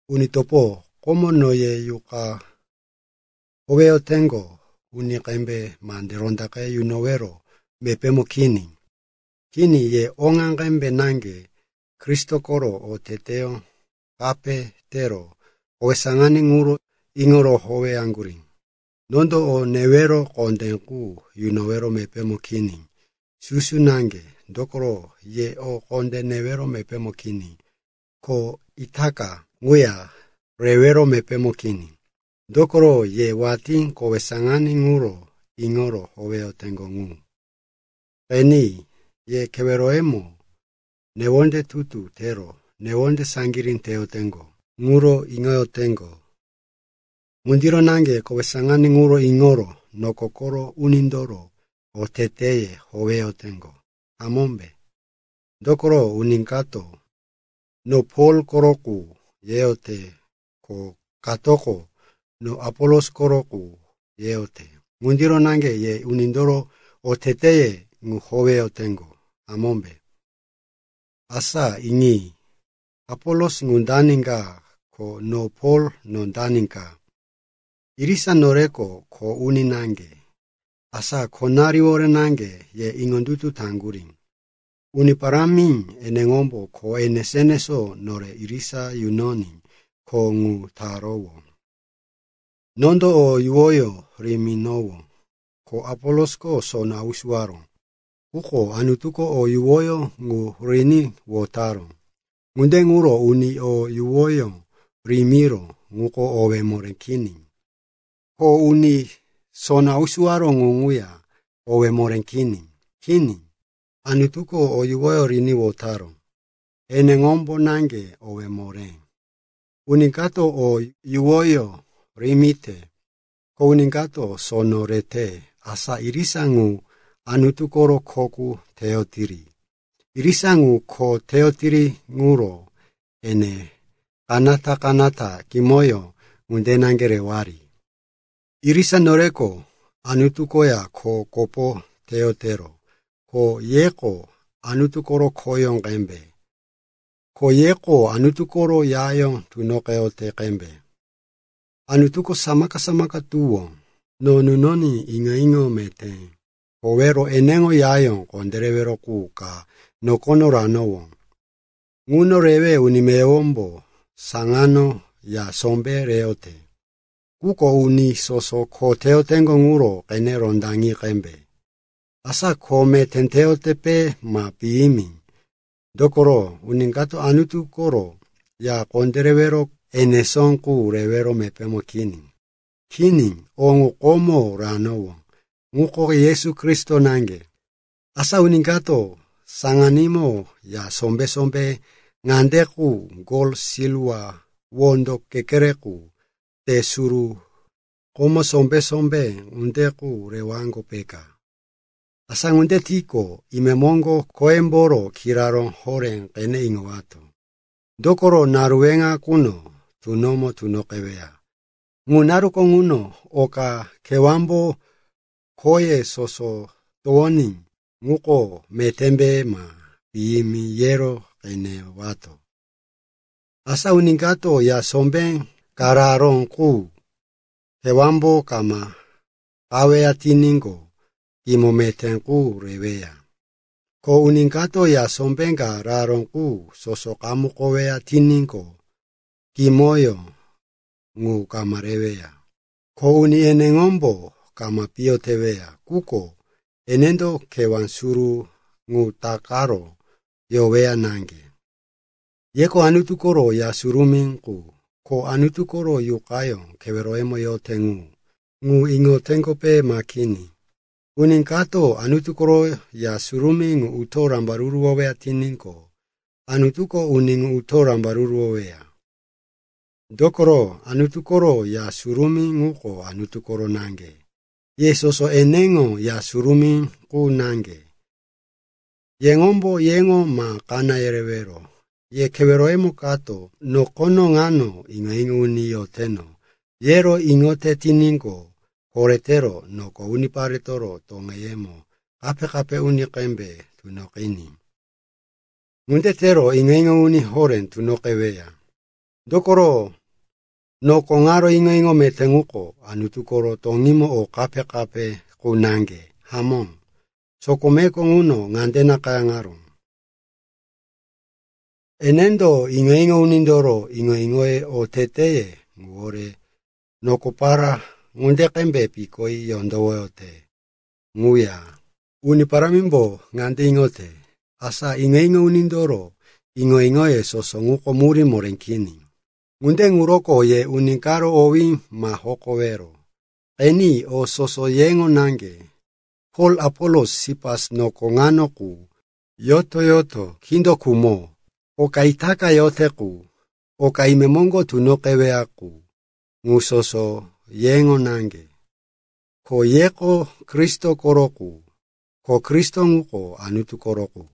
Uni topo, komo no ye Yuqa howeyoteŋgo uni qembe mande rondaqe yunowero mepémo kini. Kini, ye oŋa qembe naŋge Kristo koro oteteyó kape tero kowe saŋaní ŋuro iŋoro howeyaŋgurí. Nondo o newero kondé qu yunowero mepémo kini, susu naŋge, dokoro ye o kondé rewero mepémo kini. Ko itaka ŋuya rewero mepémo kini, dokoro ye watí kowe saŋaní ŋuro iŋoro howeyoteŋgo ŋu. Qeni, ye keweroyemo newonde tutu tero newonde saŋgirí teyoteŋgo ŋuro iŋoyoteŋgo. Ŋundiro naŋge kowe saŋaní ŋuro iŋoro noko koro unindoro oteteye howeyoteŋgo, hamómbe? Dokoro uni kato, “No Pol koro qu,” yeyote ko katoko, “No Apolos koro qu,” yeyote. Ŋundiro naŋge ye unindoro oteteye ŋu howeyoteŋgo, hamómbe? Asa iŋi. Apolos ŋu dani ka? Ko no Pol, no dani ka? Irisa noreko kho uni naŋge, asa khonariwore naŋge ye iŋondutu taŋgurí. Uni Parámi eneŋombo kho enesó-enesó nore irisa yunoní kho ŋu tarowó. Nondo o yuwoyó riminowó, ko Apolosko sono hausuwaró, quko Anutuko o yuwoyó ŋu riní wotaró. Ŋunde ŋuro uni o yuwoyó rimiró ŋuko owé moré kini. Ko uni sono hausuwaró ŋu ŋuya owé moré kini. Kini, Anutuko o yuwoyó riní wotaró, eneŋombo naŋge owé moré. Uni kato o yuwoyó rimite, ko uni kato sono rete, asa irisa ŋu Anutu koro kho qu teyotiri. Irisa ŋu kho teyotiri ŋuro ene kanata-kanata kimoyó ŋunde naŋge rewari. Irisa noreko Anutu koya kho kopo teyotero ko yeko Anutu koro khoyó qembe. Ko yeko Anutu koro yayó towoyote qembe. Anutuko samaka-samaka tuwó no nunoní iŋo-iŋo meté howero eneŋo yayó kondérewero qu ka nokono ranowó. Ŋuno rewe uni meyowombo saŋano ya sombé reyote. Quko uni soso kho teyoteŋgo ŋuro qene rondaŋi qembe, asa kho meté teyoteŋgope ma piyimi. Dokoro uni kato Anutu koro ya kondérewero enesó qu rewero mepémo kini. Kini o ŋu komo ranowó, ŋuko Yesu Kristo naŋge. Asa uni kato saŋanímo ya sombé-sombé ŋande qu: gol, silwa, wondo kekere qu, te, suru, komó, sombé-sombé ŋunde qu rewaŋgo, peka. Asa ŋunde tiqo, imemoŋgo khoyemboro kiraró horé qene iŋowato, dokoro naru weŋa quno tunomo tunoqeweya. Ŋu naruko ŋuno oka kewámbo khoye soso towoŋoní ŋuko metémbe ma piyimi yero qenewato. Asa uni kato ya sombé ka raró qu kewámbo kama qaweya tiníqo, kimoyó meté qu reweya. Ko uni kato ya sombé ka raró qu soso qamukoweya tiníqo, kimoyó ŋu kama reweya. Kho uni eneŋomboko kama piyo teweya, quko enendo kewá suru ŋu takaro yoweya naŋge. Yeko Anutu koro Ya Surumí qu, ko Anutu koro Yuqayó keweroyemo yote ŋu. Ŋu iŋoteŋgope, ma kini? Uni kato Anutu koro Ya Surumí ŋu uto rambaruruwote tiníqo, Anutuko uni ŋu uto rambaruruwoweya. Dokoro Anutu koro Ya Surumí ŋuko Anutu koro naŋge. Ye soso eneŋo Ya Surumí qu naŋge. Yeŋombo yeŋo ma kaná yerewero. Ye keweroyemo kato, “No nokono ŋano iŋo-iŋo uni yoteno,” yero iŋoyote tiníqo, koretero noko uniparetoro toŋeyemo kape-kape uni qembe tunoqiní. Ŋunde tero iŋo-iŋo uni horé tunoqeweya. Dokoro noko ŋaro iŋo-iŋo meté ŋuko Anutu koro toŋímo o kape-kape qu naŋge. Hamó, sokomeko ŋuno ŋande nakayáŋaró, “Enendo iŋo-iŋo unindoro iŋo-iŋo oteteye ŋuwore nokopara ŋunde qembe pikoní yondowoyote.” Ŋuya, “Uni Parámimbo ŋande iŋote, asa iŋo-iŋo unindoro iŋo-iŋoye soso ŋuko murí moré kini.” Ŋunde ŋuroko ye uni karo owí ma hokowero. Qeni, o soso yeŋo naŋge. Pol, Apolos, Sipas, noko ŋano qu, yoto-yoto, kindo khumo, oka itaka yote qu, oka imemoŋgo tunoqeweya qu, ŋu soso yeŋo naŋge. Ko yeko Kristo koro qu, ko Kristo ŋuko Anutu koro qu.